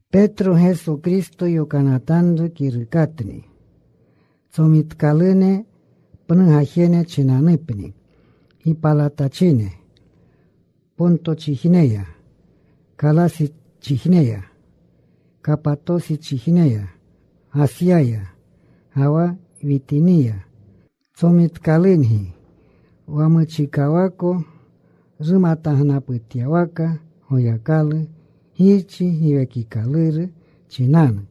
Petro, Geso Kristo yokanatanru kirukatni. Tsomitkalune, pnu gajene chinanupni, gipalatachine Pontochijneya, Kalasichijneya, Kapatosichijneya, Gasyaya, ga wa Witiniya. Tsomitkalungi wa muchikawako rumatagnaputyawaka Goyakalu Girchi. Giwekikaluru chinanu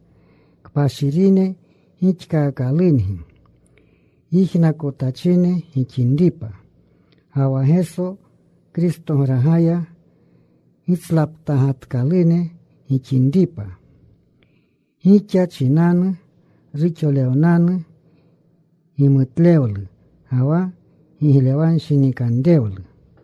kpashirine gixkaakalungi, yijnakotachine gixinripa ga wa Geso Kristograga gitslaptagatkalune gixinripa. Gixa chinanu ruxolewnanu gimutlewlu ga wa giglewanshinikanrewlu.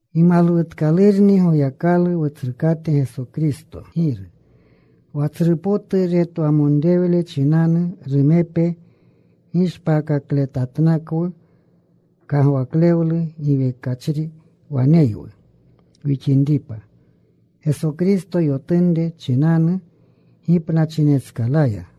Gimalwutkalurni Goyakalu, Wutsrukate Geso Kristo Giru. Wa tsru potu retwamonrewle chinanu, rumepe gishpaakakletatnakwu. Kagwaklewlu giwekachri waneywu wixinripa Geso Kristo yotunre chinanu gipnachinetskalaya.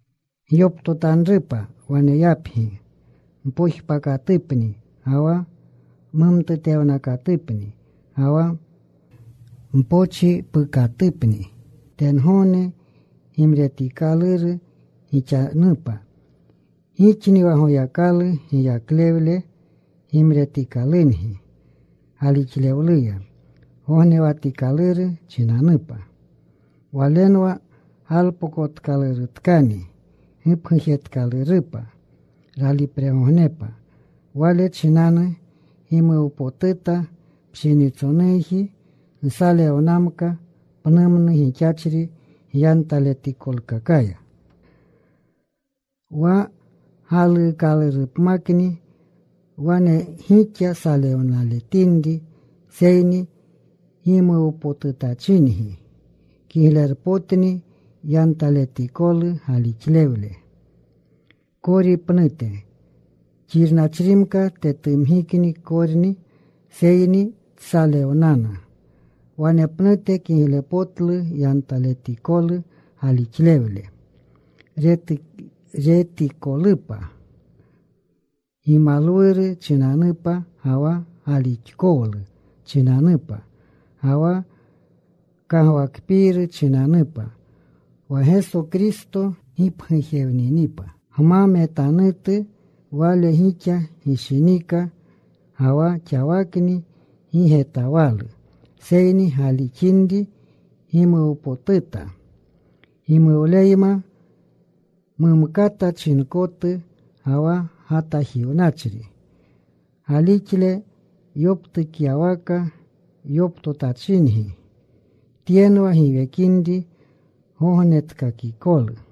Gyoptotanrupa waneyapgi mpojpakatupni ga wa mumtutewnakatupni ga wa mpochipukatupni, tengogne gimretikaluru gixanupa. Gixni wa Goyakalu giyaklewle gimretikalungi galixlewluya gognewatikaluru chinanupa. Walenwa galpokotkalurutkani gipgujetkalurupa ralipregognepa. Wale chinanu gimuwpotuta. Pshinitsonuji nsalewnamka pnumnu gixachri gyantaletikolkakaya, wa galuukalurupmakni wane gixa salewnaletinri, seyni gimuwpotutachingi. Kiglerpotni yantaletikolu galixlewle kori pnute. Xirnachrimka tetumgikni korni, seyni tsalewnana. Wanepnute kiglepotlu yantaletikolu galixlewle, retikolupa gimalwuru chinanupa ga wa galixkowlu chinanupa ga wa kagwakpiiru chinanupa wa Geso Kristo gipgujewninipa. Gma metanutu Wale gixa gishinika. Ga wa xawakni gi getawalu, seyni galixinri, gimuwpotuta, gimuwleyma mumkata chinkotu ga wa gatajiwnachri. Galixle yoptukyawaka yoptotachingi. Tyenwa giwekinri gognetkakikolu.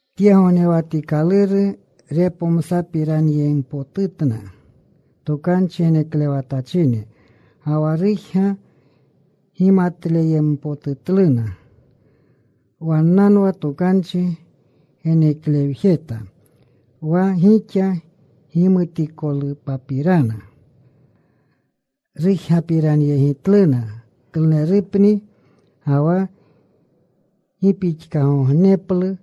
Tye gognewatikaluru repomsapiranyempotutna tokanchi geneklewatachine, ga wa rujga gimatleyempotutluna. Wannanwa tokanchi geneklewjeta wa gixa gimutikolupapirana. Rujgapiranyegitluna klunerupni ga wa gi pixkagogneplu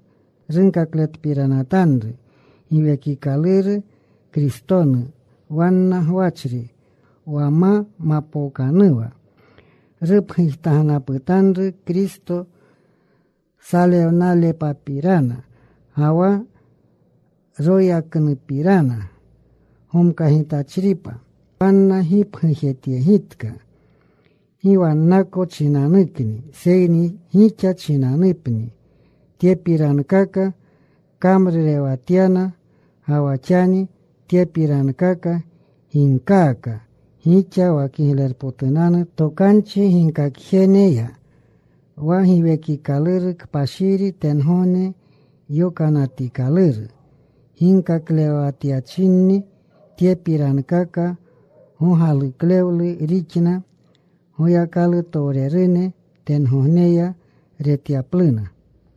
runkakletpiranatanru Giwekikaluru Kristonu wanna gwachri. Wa ma mapookanuwa rupgujtagnaputanru Kristo salewnalepapirana ga wa royaknupirana gomkagitachripa. Wanna gipgujetyegitka gi wannako chinanukni seyni gixa chinanupni tyepirankaka kamrurewatyana. Ga wa xani tyepirankaka ginkaaka gixa wa Kiglerpotunanu Tokanchi ginkakjeneya, wa Giwekikaluru Kpashiri tengogne yokanatikaluru ginkaklewatyachinni. Tyepirankaka gogaluklewlu rixna Goyakalutowrerune tengogneya retyapluna.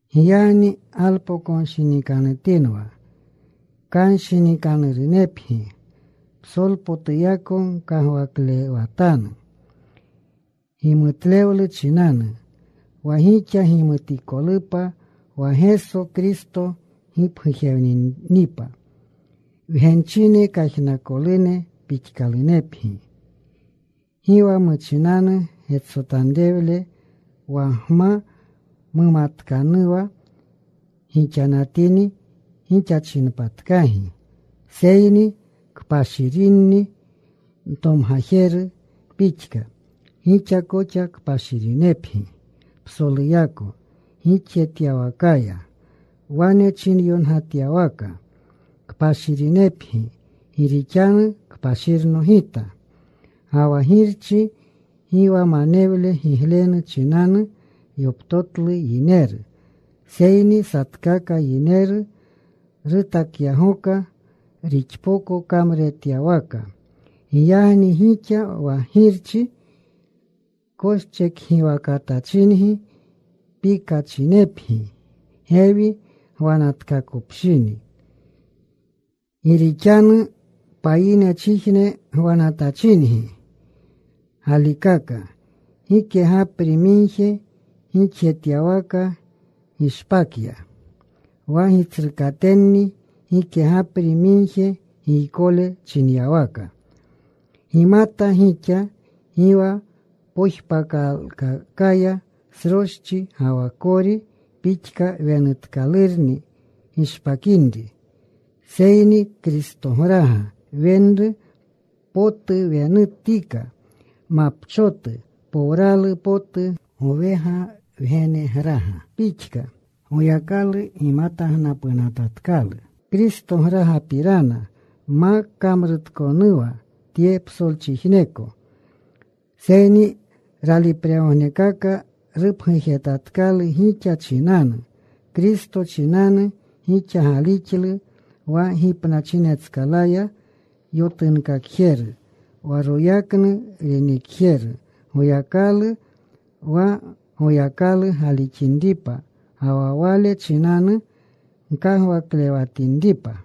Giyagni galpokonshinikanutinwa. Kanshinikanurunepgi. Psolpotuyako gkagwaklewatanu gimutlewlu chinanu wa gixa gimutikolupa wa Geso Kristo gipgujewninipa. Wgenchine kajnakolune pixkalunepgi. Gi wa muchinanu getsotanrewle wa gma mumatkanuwa gixanatini, gixachinpatkagi. Seyni kpashirni ntomgajeru pixka, gixa koxa kpashirinepgi psoluyako gixjetyawakaya. Wane chinyongatyawaka: Kpashirinepgi gi rixanu kpashirno Gita. Ga wa Girchi gi wa manewle giglenu chinanu yoptotlu yineru, seyni satkaka yineru rutakyagoka rixpoko kamruretyawaka. Giyagni gixa wa Girchi koschekgiwakatachingi, pikachinepgi gewi gwanatkakopshini, gi rixanu payinechijne gwanatachingi galikaka. Gike gapri migje gixjetyawaka gishpakya, wa gitsrukatenni gike gapri migje giykole chinyawaka. Gimata, gixa gi wa pojpakalkakaya sroschi ga wa kori pixka wenutkalurni gishpakinri. Seyni Kristograga kwenuru potu wenutika, mapchotu powralu potu gowega wgenegraga pixka. Goyakalu gimatagnapunatatkalu Kristogragapirana ma kamrutkonuwa tye psolchijneko, seyni ralipregognekaka rupgujetatkalu gixa chinanu. Kristo chinanu gixa galixlu wa gipnachinetskalaya yotunkakjeru, wa royaknu renekjeru, Goyakalu, wa Goyakalu galixinripa ga wa Wale chinanu gkagwaklewatinripa.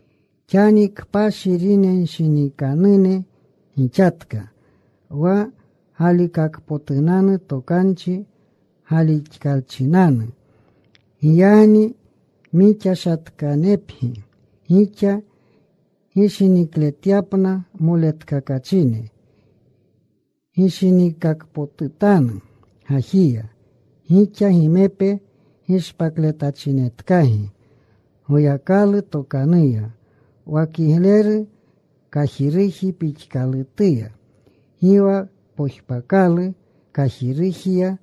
Xani kpashirinshinikanune gixatka wa galikakpotunanu tokanchi galixkalchinanu. Giyagni mixashatkanepgi gixa gishinikletyapna moletkakachine. Gishiniikakpotutanu gajiya. Gixa gimepe gishpakletachinetkagi Goyakalu tokanuya, wa kigleru kajiruji pixkalutuya. Gi wa pojpakalu kajirujiya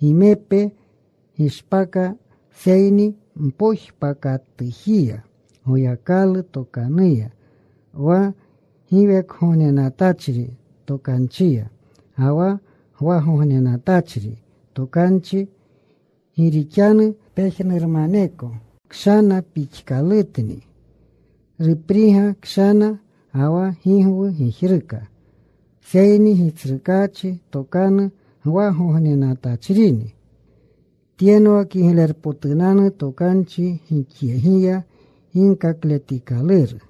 gimepe gishpaka, seyni mpojpakajituya, Goyakalu tokanuya, wa giwekgognenatachri Tokanchiya ga wa gwagognenatachri Tokanchi. Gi rixanu: Pejnurmaneko kshana pixkalutni, Rupriga kshana ga wa gigwu gijruka. Seyni Gitsrukaachi tokanu gwagognenatachrini. Tyenwa kiglerpotunanu tokanchi gixyegiya ginkakletikaluru.